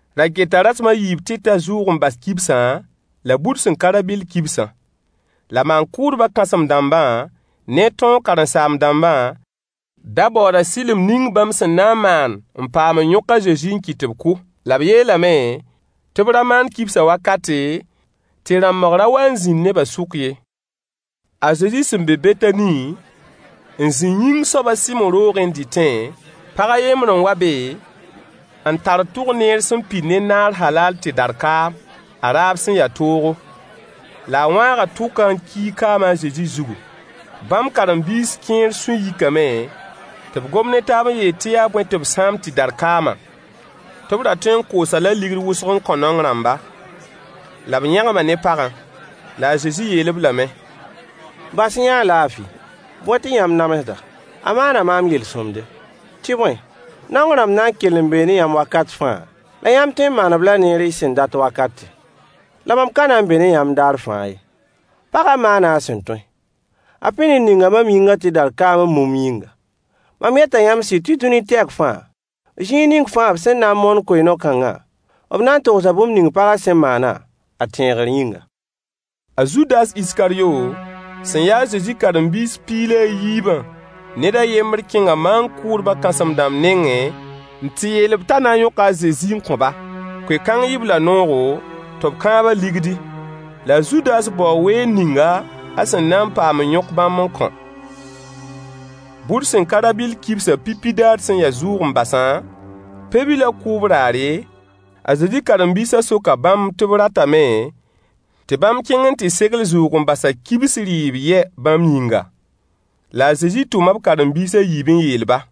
Ra keta rasem a yiib tɩ ta zʋʋg-n-bas kibsã, la bur sẽn ka rã-bɩll kibsã. La maan-kʋʋdbã kãsem-dãmbã ne tõog karen-saam-dãmbã da baooda sɩlem ning bãmb sẽn na n maan n paam n yõk a Zezi n kɩt tɩ b kʋ. La b yeelame tɩ b ra maan kibsã wakate, tɩ rãmbg ra wa n zĩnd nebã sʋk ye. A Zezi sẽn be Betani n zĩ yĩng soab a Sɩmo roogẽ n dɩtẽ, pag a yembr n wa be n tar albatre tʋk sẽn pid ne naar halaal tɩdar kaam, a raab sẽn ya toogo. La a wãaga tʋkã n kiig kaamã a Zezi zugu. Bãmb karen-biis kẽer sũy yikame tɩ b gom ne taab n yeel tɩ yaa bõe tɩ b sãam tɩdar kaamã? Tɩ b ra tõe n koos-a-la deniye kobs-tã n kõ naong rãmba. La b yẽgma ne pagã. La a Zezi yeel-b lame: Bas-y-yã-a laafɩ. Bõe tɩ yãmb namsd-a? A maana maam yel-sõmde. Tɩ bõe, naong rãmb na n kell n bee ne yãmb wakat fãa, la yãmb tõe n maan-b la neer y sẽn dat wakate. La mam ka na n be ne yãmb daar fãa ye. Pagã maana a sẽn tõe. A pĩnd n ninga mam yĩngã tɩdar kaam m mumb yĩnga. Mam yeta yãmb sɩda tɩ dũni tɛk fãa, zĩig ning fãa b sẽn na n moon koe-no-kãngã, b na n togsa bũmb ning pagã sẽn maanã, a tẽegr yĩnga. A Zudas Iskaryo sẽn ya a Zezi karen-biis piig la a yiibã ned a yembr kẽnga maan-kʋʋdbã kãsem-dãmb nengẽ n tɩ yeel-b t'a na n yõka a Zezi n kõ-ba. Koe-kãng yɩ-b la noogo, tɩ b kãab-a ligdi. La a Zudas baoo weer ninga a sẽn na paam n yõk bãmb n kõ. Bur sẽn ka rabɩll kibsã pipi daar sẽn ya zʋʋg-n-basã pe-bilã kʋʋb raare, a Zezi karen-biisã soka bãmb tɩ b ratame tɩ bãmb kẽng n tɩ segl zʋʋg-n-basã kibs rɩɩb yɛ bãmb yĩnga. La a Zezi tʋma b karen-biis a yiib n yeel-ba: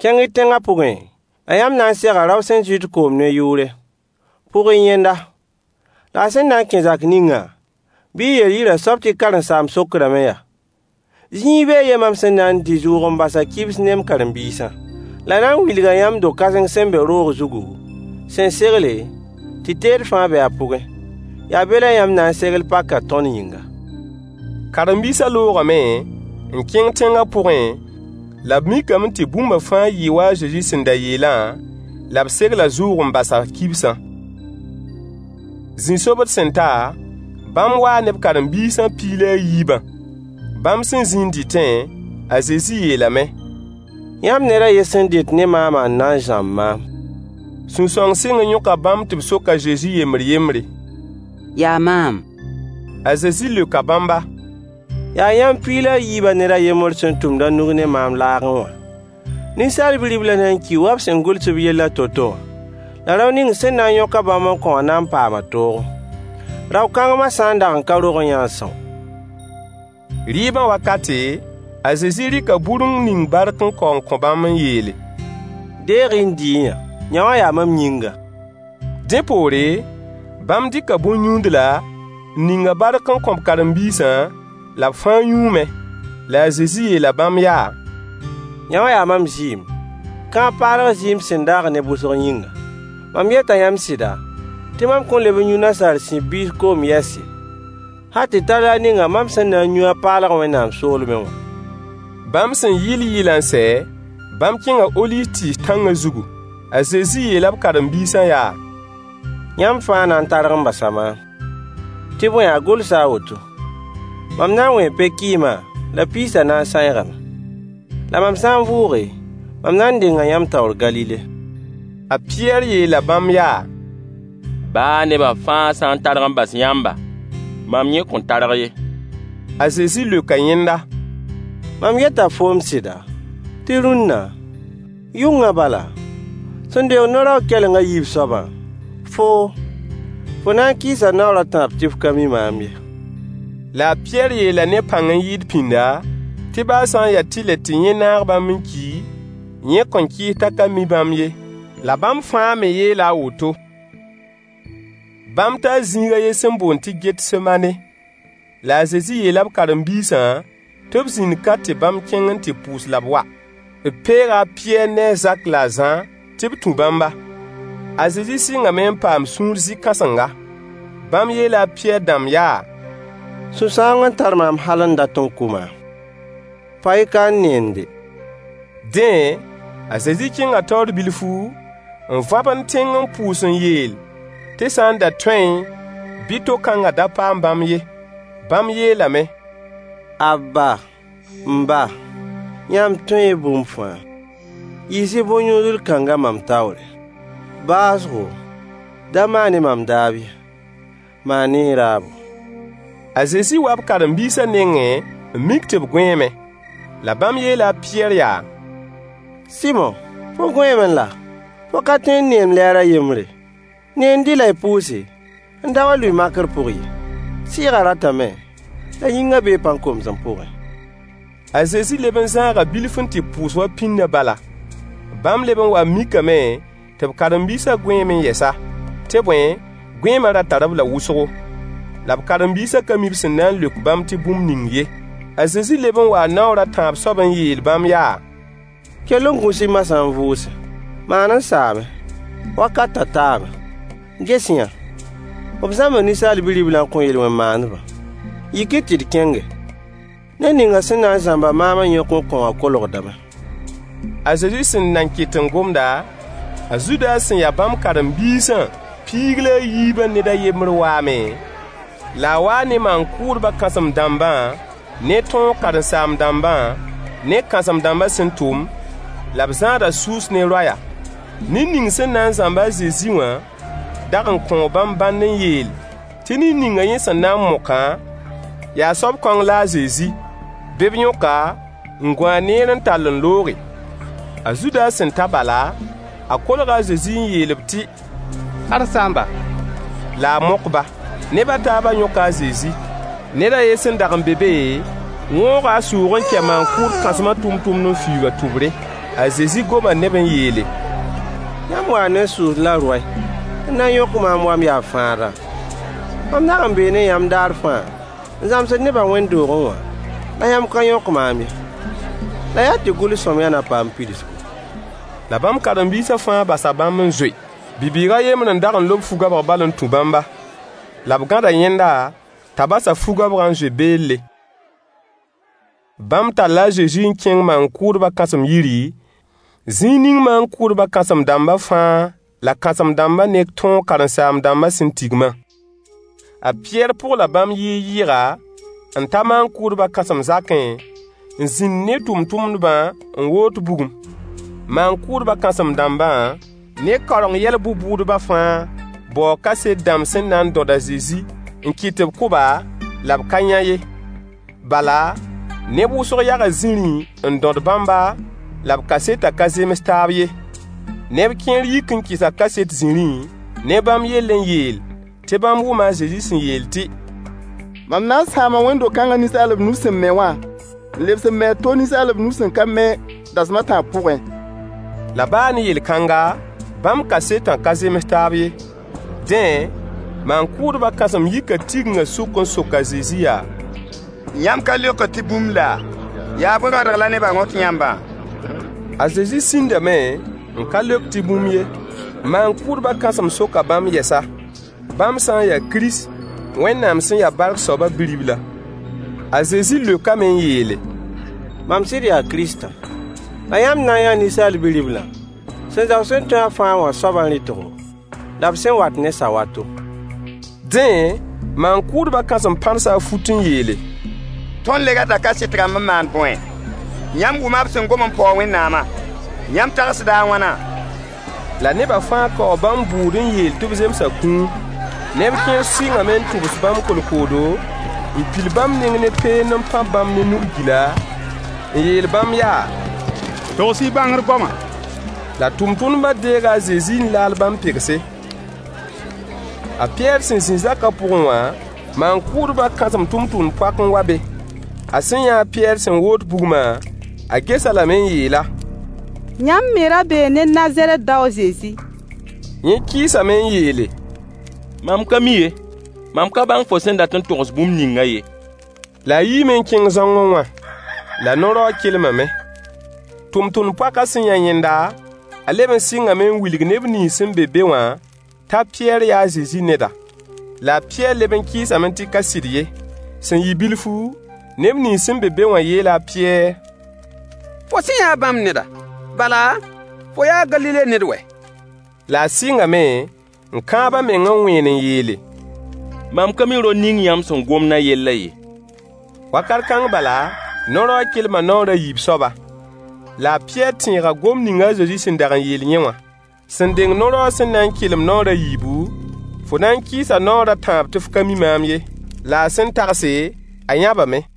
Kẽng-y tẽngã pʋgẽ, la yãmb na n sega rao sẽn zɩt koom ne yʋʋre. Pʋg-y yẽnda. La a sẽn na n kẽ zak ningã, bɩ y yeel yirã soab tɩ karen-saamb sokdame yaa: “Zĩig bee yɛ mam sẽn na n dɩ zʋʋg-n-basã kibs ne m karen-biisã?” La a na n wilga yãmb do-kãseng sẽn be roog zugu, sẽn segle, tɩ teed fãa be a pʋgẽ. Yaa be la yãmb na n segl pakã tõnd yĩnga. Karen-biisã loogame n kẽng tẽngã pʋgẽ, la b mikame tɩ bũmba fãa yɩɩ wa a Zezi sẽn da yeelã, la b segla zʋʋg-n-basã kibsã. Zĩ-sobd sẽn ta, bãmb waa ne b karen-biisã piig la a yiibã. Bãmb sẽn zĩ n dɩtẽ, a Zezi yeelame: Yãmb ned a yen sẽn dɩt ne maamã n na n zãmb maam. Sũ-sãoong sɩng n yõka bãmb tɩ b sok a Zezi yembr-yembre: Yaa maam? A Zezi leoka bãmba: Yaa yãmb piig la a yiibã ned a yembr sẽn tʋmd a nug ne maam laagẽ wã. Ninsaal Bi-riblã na n kii wa b sẽn gʋls b yellã to-to wã. La rao ning sẽn na n yõk-a bãmb n kõ wã na n paama toogo. Rao-kãng ma sã n dag n ka rogẽ-yã-a n são. Rɩɩbã wakate, a Zezi rɩka bur n ning bark n kao n kõ bãmb n yeele: Deeg-y n dɩ-y-yã. Yõwã yaa mam yĩngã. Dẽ poore, bãmb dɩka bõn-yũudla, n ning-a bark n kõ b karen-biisã, la b fãa yũume. La a Zezi yeela bãmb yaa: Yõwã yaa mam zɩɩm, kãab-paalg zɩɩm sẽn daag neb wʋsg yĩnga. Mam yeta yãmb sɩda, tɩ mam kõn leb n yũ nasaar sib biis koom yɛs ye, hal tɩ ta daar ninga mam sẽn na n yũ a paalg Wẽnnaam soolmẽ wã. Bãmb sẽn yɩɩl yɩɩlã n sɛ, bãmb kẽnga oliiv tɩɩs tãngã zugu. A Zezi yeela b karen-biisã yaa: Yãmb fãa na n targ n basa maam. Tɩ bõe a gʋlsa a woto: “Mam na n wẽe pe-kɩɩmã, la piisã na n sãeegame.” La mam sã n vʋʋge, mam na n denga yãmb taoor Galile. A Pɩyɛɛr yeela bãmb yaa: Baa neba fãa sã n targ n bas yãmba, mam yẽ kõn targ ye. A Zezi leoka yẽnda: Mam yeta foom sɩda, tɩ rũnna, yʋngã bala, sẽn deng no-raoog kɛleng a yiib soabã, foo, fo na n kɩɩsa naoor a tãab tɩ f ka mi maam ye. La a Pɩyɛɛr yeela ne pãng n yɩɩd pĩnda, tɩ baa sã n ya tɩlɛ tɩ yẽ naag bãmb n ki, yẽ kõn kɩɩs t'a ka mi bãmb ye. La bãmb fãa me yeela a woto. Bãmb taa zĩig a yen sẽn boond tɩ Getsemaane. La a Zezi yeela b karen-biisã tɩ b zĩnd ka tɩ bãmb kẽng n tɩ pʋʋs la b wa. B peega a Pɩyɛɛr ne a Zak la a Zã tɩ b tũ bãmba. A Zezi sɩngame n paam sũur zɩ-kãsenga. Bãmb yeela a Pɩyɛɛr dãmb yaa: Sũ-sãoong n tar maam hal n dat n kʋ maam. Pa-y ka n neende. Dẽ, a Zezi kẽnga taoor bilfu, n vãbend tẽng n pʋʋs n yeel tɩ sã n da tõeẽ bɩ to-kãngã da paam bãmb ye. Bãmb yeelame: Abba, m ba, yãmb tõee bũmb fãa. Yiis-y bõn-yũudl kãngã mam taoore. Baoosgo, da maan-y mam daab ye, maan-y y raabo. A Zezi waa b karen-biisã nengẽ n mik tɩ b gõeeme. La bãmb yeela a Pɩyɛɛr yaa: Sɩmo, fo gõeeme laa? Fo ka tõe n neend lɛɛr a yembre? Neend-y la y pʋʋse n da wa n lʋɩ makr pʋg ye. Sɩɩgã ratame, la yĩngã bee pãn-komsem pʋgẽ. A Zezi leb n zãaga bilf n tɩ pʋʋs wa pĩndã bala. Bãmb leb n waa n mikame tɩ b karen-biisã gõeeme yɛsa, tɩ bõe, gõeema ra tar-b la wʋsgo. La b karen-biisã ka mi b sẽn na n leok bãmb tɩ bũmb ning ye. A Zezi leb n waa naoor a tãab soab n yeel bãmb yaa: Kell n gũs-y moasã n vʋʋse. Maan n saame. Wakatã taame. Ges-y-yã, b zãmba Ninsaal Bi-riblã n kõ yel-wẽn maandbã. Yik-y tɩ d kẽnge. Ned ninga sẽn na n zãmb-a maam n yõk n kõ wã kolgdame. A Zezi sẽn nan ket n gomda, a Zudas sẽn ya bãmb karen-biisã piig la a yiibã ned a yembr waame, la a waa ne neb kʋʋng maan-kʋʋdbã kãsem-dãmbã ne tõog karen-saam-dãmbã ne kãsem-dãmbã sẽn tʋm, la b zãada sʋʋs ne roaya. Ned ning sẽn na n zãmb a Zezi wã dag n kõo bãmb bãnd n yeel tɩ ned ninga yẽ sẽn na n mokã, yaa soab kõng la a Zezi. Bɩ b yõk-a, n gũ-a neer n tall n looge. A Zudas sẽn ta bala, a kolga a Zezi n yeel-b tɩ “karen-saamba,” la a mok-ba. Neb a taabã yõka a Zezi. Ned a yen sẽn dag n be be wõoga a sʋʋg n kɛ maan-kʋʋd kãsmã tʋmtʋmd n fiuug a tʋbre. A Zezi goma ne-b n yeele: Yãmb waa ne sʋʋs la roay n na n yõk maam wa m yaa fãada! Mam dag n bee ne yãmb daar fãa n zãmsd nebã wẽnd-doogẽ wã, la yãmb ka yõk maam ye. La yaa tɩ gʋls-sõmyã na paam pidsgu. La bãmb karen-biisã fãa basa bãmb n zoe. Bi-bɩɩg a yembr n dag n lob fu-goabg bal n tũ bãmba. La b gãda yẽnda t'a bas a fu-goabgã n zoe beelle. Bãmb talla a Zezi n kẽng maan-kʋʋdbã kãsem yiri, zĩig ning maan-kʋʋdbã kãsem-dãmba fãa la kãsem-dãmbã ne tõog karen-saam-dãmbã sẽn tigmã. A Pɩyɛɛr pʋgla bãmb yɩɩg-yɩɩga, n ta maan-kʋʋdbã kãsem zakẽ n zĩnd ne tʋmtʋmdbã n woot bugum. Maan-kʋʋdbã kãsem-dãmbã ne kaoreng yɛl bʋ-bʋʋdbã fãa baoo kaset dãmb sẽn na n dõd a Zezi n kɩt tɩ b kʋ-ba, la b ka yã ye. Bala, neb wʋsg yaga zĩrĩ n dõd bãmba la b kasetã ka zems taab ye. Neb kẽer yik n kɩsa kaset zĩrĩ ne bãmb yell n yeel tɩ bãmb wʋma a Zezi sẽn yeel tɩ: Mam na n sãama Wẽnd-do-kãnga ninsaalb nus sẽn me wã, n lebs n me a to ninsaalb nus sẽn ka me, dasem a tãab pʋgẽ. La baa ne yel-kãnga, bãmb kasetã ka zems taab ye. Dẽ, maan-kʋʋdbã kãsem yika tigingã sʋk n sok a Zezi yaa: Yãmb ka leokd tɩ bũmb laa? Yaa bõe rõadg la nebã rõt yãmbã? A Zezi sĩndame n ka leok tɩ bũmb ye. Maan-kʋʋdbã kãsem soka bãmb yɛsa, bãmb sã n yaa Kirist, Wẽnnaam sẽn ya bark soabã Bi-ribla. A Zezi leokame n yeele: Mam sɩd yaa Kirist. La yãmb na n yãa “Ninsaal Bi-riblã sẽn zao sẽn-tõe-a-fãa wã soabã rɩtgo, la b sẽn wat ne sawato.” Dẽ, maan-kʋʋdbã kãsem pãrsa a fut n yeele: Tõnd le rata kaset rãmb n maan bõe? Yãmb wʋma b sẽn gom n paoog Wẽnnaamã. Yãmb tagsda a wãna? La nebã fãa kaoo bãmb bʋʋd n yeel tɩ b zemsa kũum. Neb kẽer sɩngame n tʋbs bãmb kolkoodo, n pil bãmb neng ne peend n pãb bãmb ne nug-gila, n yeel bãmb yaa: Togs-y bãngr goama. La tʋmtʋmdbã deega a Zezi n laal bãmb pegse. A Pɩyɛɛr sẽn zĩ zakã pʋgẽ wã, maan-kʋʋdbã kãsem tʋmtʋmd-poak n wa be. A sẽn yã a Pɩyɛɛr sẽn woot bugmã, a ges-a lame n yeel-a: Yãmb me ra bee ne Nazarɛt dao a Zezi. Yẽ kɩɩsame n yeele: Mam ka mi ye. Mam ka bãng fo sẽn dat n togs bũmb ningã ye. La a yiime n kẽng zãongẽ wã. [La no-raoog kelmame.] Tʋmtʋmd-poakã sẽn yã yẽnda, a leb n sɩngame n wilg neb nins sẽn be be wã t'a Pɩyɛɛr yaa a Zezi neda. La a Pɩyɛɛr leb n kɩɩsame tɩ ka sɩd ye. Sẽn yɩ bilfu, neb nins sẽn be be wã yeela a Pɩyɛɛr: Fo sẽ ya bãmb neda, bala, fo yaa Galile ned wɛ! La a sɩngame n kãab a meng n wẽen n yeele: Mam ka mi rao ning yãmb sẽn gomd a yellã ye. Wakat kãng bala, no-raoog kelma naoor a yiib soaba. La a Pɩyɛɛr tẽega gomd ning a Zezi sẽn dag n yeel yẽ wã: Sẽn deng no-raoog sẽn na n kelem naoor a yiibu, fo na n kɩɩsa naoor a tãab tɩ f ka mi maam ye. La a sẽn tagse, a yãbame.